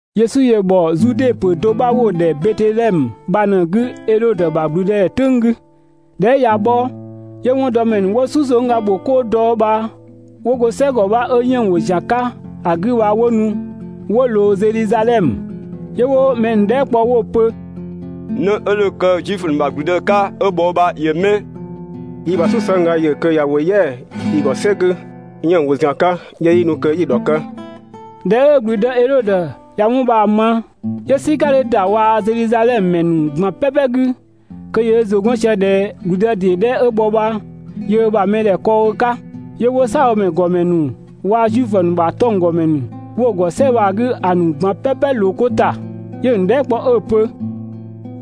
Yesu ‑yö ‑bhɔ Zude ‑pö do 'bha 'wo‑ ‑dhɛ Betedhɛmö bha ꞊në‑ 'gü Edhodö ‑bha ‑gblüdëdhɛ "tʋ̈ng 'gü. ꞊Dhɛ 'ö ꞊ya bhɔ, 'yö 'wɔndɔmɛ ‑nu 'wo "susëngga ‑nu ‑bho 'koo ‑dɔ bha 'wo go "sɛgɔ 'bha 'ö 'yënng‑ ‑wo ‑zian 'ka ‑a 'gü bha 'wo nu 'wo ꞊loo Zedhizadhɛmö. 'Yö 'wo mɛ ‑nu dhɛɛ" kpɔ 'wo‑ pö: «'Në 'ö dho kë Zuifö ‑nu ‑bha ‑gblüdë 'ka 'ö bhɔ yö bha ‑yö 'mɛ? Yi‑ ‑bha "susëngga ‑yö kö ꞊ya ‑wo "yɛa‑ yi ‑gɔ "sɛ 'gü 'yënng‑ ‑wo ‑zian 'ka 'yö 'yi nu kö 'yi‑ ‑dhɔkë.» ꞊Dhɛ 'ö ‑gblüdë Edhodö ꞊ya 'wɔn bha‑ ma, 'yö "sika 'dhö ‑da waa‑ Zedhizadhɛmö ‑mɛ ‑nu ꞊gban "pɛpɛ 'gü (kö ‑yö ö ‑zʋ 'gɔn sië ꞊dhɛ ‑gblüdë ‑dee 'dhɛ 'ö bhɔ bha yöö ö ‑bha mɛdhɛ kɔɔ‑ ö 'ka). 'Yö 'wo "saabhomɛ ‑gɔmɛ ‑nu waa‑ Zuifö ‑nu ‑bha 'tɔnggɔmɛ ‑nu 'wo‑ ‑gɔ "sɛ bha‑ 'gü ‑a ‑nu ꞊gban "pɛpɛ ꞊loo 'ko ‑ta, 'yö‑ ‑nu dhɛɛ" kpɔ 'ö‑ pö: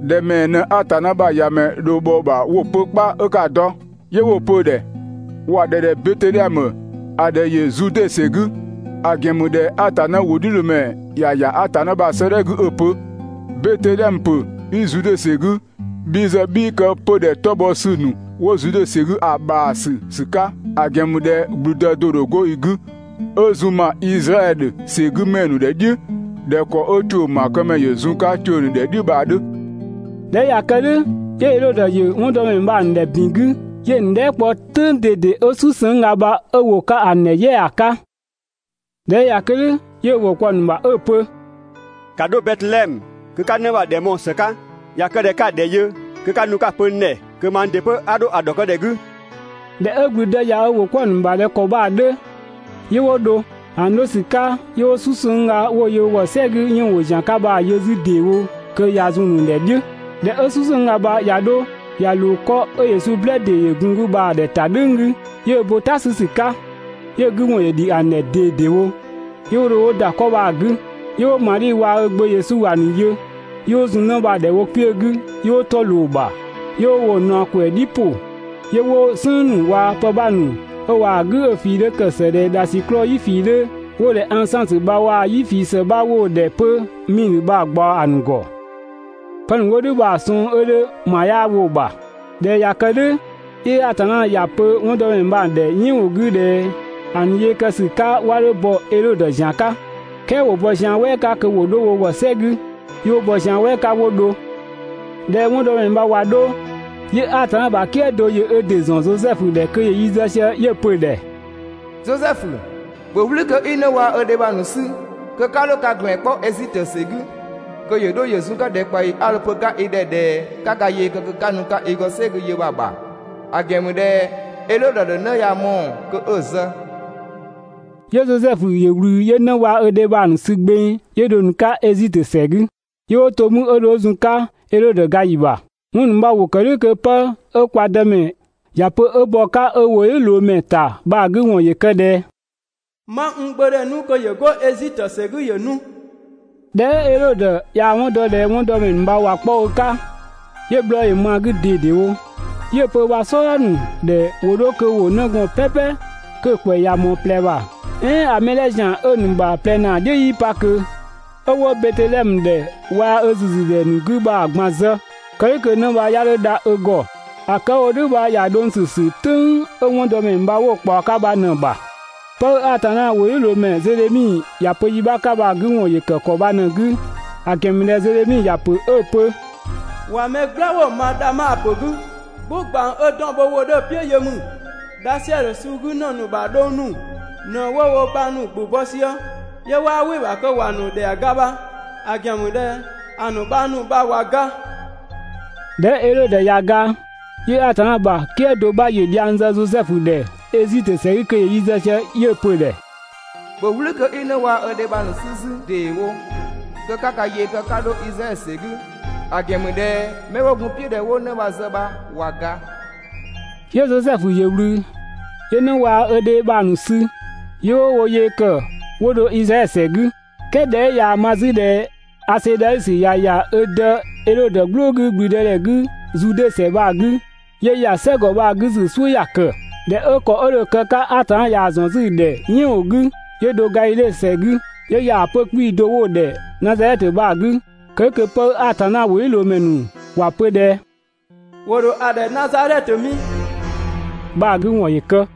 «‑Dhɛ ‑mɛɛ ꞊në Atanna ‑bha ‑Yamɛ dho bhɔ‑ ‑bha 'wo‑ pö 'kpa 'ö 'ka‑ dɔ?» 'Yö 'wo‑ pö‑ ‑dhɛ: «‑Wa ‑dhɛ ‑dhɛ Betedhɛmö, ‑a ‑dhɛ ‑yö Zude ‑sɛ 'gü.» ‑A ‑gɛn ‑mü ꞊dhɛ Atanna ‑wʋdhiʋ̈loomɛ ‑ya ‑ya Atanna ‑bha 'sëëdhɛ 'gü 'ö‑ pö: «Betedhɛmö ‑pö 'i Zude ‑sɛ 'gü, bhi ‑zë 'bhii kë 'pödhɛ 'tɔbhɔsü ‑nu 'wo Zude ‑sɛ 'gü ‑a ‑bhaasü ‑sü 'ka, ‑a ‑gɛn ‑mü ꞊dhɛ ‑gblüdë do‑ ‑dho 'go i 'gü, 'ö zun ma Izraɛdhö ‑sɛgümɛ ‑nu ‑dhɛ "dhiʋ̈ ꞊dhɛ ‑kɔ 'ö ‑tuʋ̈ ‑maakëmɛ ‑yö zun‑ 'ka ‑tuʋ̈ ‑nu ‑dhɛ "dhiʋ̈ bha‑ 'dhö.» ꞊Dhɛ 'ö ꞊ya kë "dhʋ̈, 'yö Edhodö ‑yö 'wɔndɔmɛ ‑nu bha‑ ‑nu ‑dhɛ ‑bin 'gü, 'yö‑ ‑nu dhɛɛ" kpɔ "tʋ̈ng ꞊dede 'ö "susëngga bha 'ö ‑wo 'ka ‑a ‑nu ‑dhɛ "yɛa‑ ‑a 'ka. ꞊Dhɛ 'ö ꞊ya kë "dhʋ̈, 'yö ö ‑wʋ kpɔ‑ ‑nu ‑bha 'ö‑ pö: «‑Ka 'dho Betedhɛmö kö 'ka 'në bha‑ ‑dhɛ mɔɔ‑ ‑së 'ka. ꞊Ya kë ꞊dhɛ 'ka‑ ‑dhɛ yö kö 'ka nu 'ka‑ pö n ‑dhɛ kö mang ‑dɩ 'pö 'a 'dho‑ ‑dhɔkë ‑dhɛ 'gü.» ꞊Dhɛ 'ö ‑gblüdë ꞊ya ö ‑wʋ 'kpɔ‑ ‑nu ‑bha ꞊dhɛ ‑kɔ bha‑ 'dhö, 'yö 'wo dho. ‑A ‑nu 'dho ‑sü 'ka, 'yö 'wo "susëngga 'wo‑ yö wo ‑gɔ "sɛ 'gü 'yënng‑ ‑wo ‑zian 'ka bha‑ yö 'zü ‑deewo kö ꞊ya zun‑ ‑nu ‑dhɛ "dhiʋ̈, ꞊Dhɛ 'ö "susëngga bha ꞊ya 'dho ꞊ya ꞊loo 'kɔ 'ö Yesu "blë ‑dee ‑yö gun‑ 'gü bha‑ ‑dhɛta "dhʋ̈ng 'gü, 'yö ö bo "ta 'sü ‑sü 'ka, 'yö‑ 'gü ‑wɔn ‑yö ‑dhi ‑a ‑nu ‑dhɛ ꞊dedewo. 'Yö 'wo dho 'wo ‑da 'kɔ bha‑ 'gü, 'yö 'wo Madhi waa‑ ö gbö Yesu ‑a ‑nu yö, 'yö 'wo zun 'në bha‑ ‑dhɛ wo kpiö 'gü 'yö 'wo 'tɔ ꞊loo‑ ‑bha 'yö 'wo woo‑ ꞊naɔ ꞊kwɛɛ‑ ‑nu "dhi ‑pʋ, 'yö 'wo "sënng ‑nu waa‑ pë 'bha ‑nu 'ö ꞊waa‑ "gʋ̈ 'ö‑ ꞊fii 'dhö ‑kë ‑së ꞊dhɛ ‑dhasiklɔɔ "yi ꞊fii 'dhö 'wo‑ ‑dhɛ ansansö bha waa‑ "yi ꞊fii ‑së bha 'wo‑ ‑dhɛ 'pö 'miidhö bha‑ ꞊gbaɔ ‑a ‑nu ‑gɔ. (Pë ‑nu 'wo "dhʋ̈ bha‑ ‑nu sɔng 'ö 'dhö ‑ma 'yaa‑ wo‑ ‑bha). ꞊Dhɛ 'ö ꞊ya kë "dhʋ̈, 'yö Atanna ‑ya pö 'wɔndɔmɛ ‑nu bha‑ ‑nu ‑dhɛ "yɛɛn ‑wʋ 'gü ꞊dhɛ ‑a ‑nu yee kë ‑sü 'ka 'wa 'dho bɔ Edhodö ‑zian 'ka, "kɛɛ ‑wo bɔ zian "wɛɛ 'ka kö ‑wo 'dho wo ‑gɔ "sɛ 'gü. 'Yö 'wo bɔ zian "wɛɛ 'ka 'wo dho. ꞊Dhɛ 'ö 'wɔndɔmɛ ‑nu bha ꞊wa 'dho, 'yö Atanna ‑bha "kië do ‑yö ö ‑dɩ ‑zɔn Zosɛfu ‑dhɛ kö ‑yö yi zë sië, 'yö‑ pö‑ ‑dhɛ: «Zosɛfu, ‑bhö "wlü kö 'i 'në waa‑ ö dhe bha‑ ‑nu 'sü kö 'ka 'dho ka ‑gblɛn 'kpɔ Ezitö ‑sɛ 'gü kö ‑yö 'dho ‑yö zun‑ 'ka ‑dhɛkpaɔyi 'a dho‑ pö‑ 'ka i ‑dhɛ ꞊dhɛ 'ka ka yee kë 'ka nu‑ 'ka i ‑gɔ "sɛ 'gü yö bha‑ ‑bha. ‑A ‑gɛn ‑mü ꞊dhɛ Edhodö ‑dho 'në ya‑ mɔɔ‑ kö 'ö‑ zë.» 'Yö Zosɛfu ‑yö ꞊wlü 'yö 'në waa‑ ö dhe bha‑ ‑nu sü gbeng, 'yö dho‑ ‑nu 'ka Ezitö ‑sɛ 'gü. 'Yö 'wo to 'mü 'ö dho 'ö zun‑ 'ka Edhodö ga ‑yi ‑bha. 'Wɔn ‑nu bha ‑wo ‑kë "dhʋ̈ kö 'pë 'ö kwa Dëmɛ ‑ya pö 'ö bɔ‑ 'ka ö ‑wʋdhiʋ̈loomɛ ‑ta bha‑ 'gü ‑wɔn ꞊në ‑yö kë ꞊dhɛ: «'Ma n Gbö ‑dhɛ 'nu kö ‑yö 'go Ezitö ‑sɛ 'gü ‑yö nu.» ꞊Dhɛ 'ö Edhodö ꞊yaa‑ 'wɔn dɔ ꞊dhɛ 'wɔndɔmɛ ‑nu bha ꞊wa 'kpɔ ö 'ka, 'yö bhlɔɔ ‑yö ma‑ 'gü ꞊dedewo, 'yö‑ pö ö ‑bha "sɔdha ‑nu ‑dhɛ ‑wo 'dho kö ‑wo 'nëgɔɔn "pɛpɛ 'kö‑ ‑kwɛ ꞊ya ꞊mɔɔ ꞊plɛ ‑bha, "ɛɛn ‑a mɛ 'dhɛ ‑zian 'ö‑ ‑nu ‑bha ꞊plɛ ‑naa "dhiʋ̈ 'yii pa ꞊kö, 'ö 'wo Betedhɛmö ‑dhɛ waa‑ ö ‑züzü ‑dhɛ ‑nu 'gü bha‑ ꞊gban zë, (kë "dhʋ̈ kö 'në bha 'ya 'dho dha ö ‑gɔ). ‑A kë 'ö‑ wo "dhʋ̈ bha ‑ya dhʋng ‑sü ‑sü "tʋ̈ng 'ö 'wɔndɔmɛ ‑nu bha 'wo‑ ꞊kpaɔ‑ 'ka bha ꞊në‑ ‑bha. 'Pë 'ö Atanna ‑wʋdhiʋ̈loomɛ Zedhemi ‑ya pö yi 'bha 'ka bha‑ 'gü ‑wɔn ‑yö ‑kë ‑kɔ bha ꞊në‑ 'gü, ‑a ‑gɛn ‑mü ꞊dhɛ Zedhemi ‑ya ‑pö 'ö‑ pö: «꞊Wa mɛ "gblawʋ ma Dhama ‑pö 'gü, "gbʋ ꞊gbang 'ö ‑dɔn bho ‑wʋ 'dhö‑ "piʋ̈ yö ‑mü, Dhasɛdhö suu 'gü ‑në ‑nu ‑bha dhong ‑nu ꞊në 'wo wo bhang ‑nu ‑gbʋ bɔ sië, 'yö 'waa "wɩ‑ ‑bha kö ‑wa ‑nu ‑dhɛa ga bha, ‑a ‑gɛn ‑mü ꞊dhɛ ‑a ‑nu bhang ‑nu bha ꞊wa ga.» ꞊Dhɛ 'ö Edhodö ꞊ya ga, 'yö Atanna ‑bha "kië do 'bha ‑yö dhiang zë 'zü Zosɛfu ‑dhɛ Ezitö ‑sɛ 'gü kö ‑yö yi zë sië 'yö‑ pö‑ ‑dhɛ: «‑Bhö "wlü kö 'i 'në waa‑ ö dhe bha‑ ‑nu 'sü 'zü ‑deewo kö 'ka ka yee kë 'ka 'dho Izraɛdhö ‑sɛ 'gü, ‑a ‑gɛn ‑mü ꞊dhɛ 'mɛ 'wo gun‑ "piʋ̈ ꞊dhɛ 'wo 'në bha‑ zë bha ꞊wa ga.» 'Yö Zosɛfu ‑yö ꞊wlü, 'yö 'në waa‑ ö dhe bha‑ ‑nu sü, 'yö 'wo wo yee ‑kë 'wo dho Izraɛdhö ‑sɛ 'gü. "Kɛɛ ꞊dhɛ 'ö ꞊yaa‑ ma 'zü ꞊dhɛ Asedhausö ꞊ya ‑ya ö dë Edhodö "gblʋʋ 'gü ‑gblüdëdhɛ 'gü Zude ‑sɛ bha‑ 'gü, 'yö ‑ya "sɛ ‑gɔ bha‑ 'gü ‑sü "suʋ̈ ‑ya ‑kë, ꞊dhɛ 'ö ‑kɔ 'ö dho‑ kë‑ 'ka Atanna ꞊yaa‑ ‑zɔn 'zü‑ ‑dhɛ "yɛɛn ‑wʋ 'gü, 'yö dho Gadhidhe ‑sɛ 'gü, 'yö ‑ya ‑a 'pö‑ 'kpii‑ do 'wo‑ ‑dhɛ Nazadhɛtö bha‑ 'gü kë "dhʋ̈ kö 'pë 'ö Atanna ‑wʋdhiʋ̈loomɛ ‑nu ‑wa pö ꞊dhɛ «‑wo ‑dho ‑a ‑dhɛ Nazadhɛtö mi» bha‑ 'gü ‑wɔn ‑yö kë.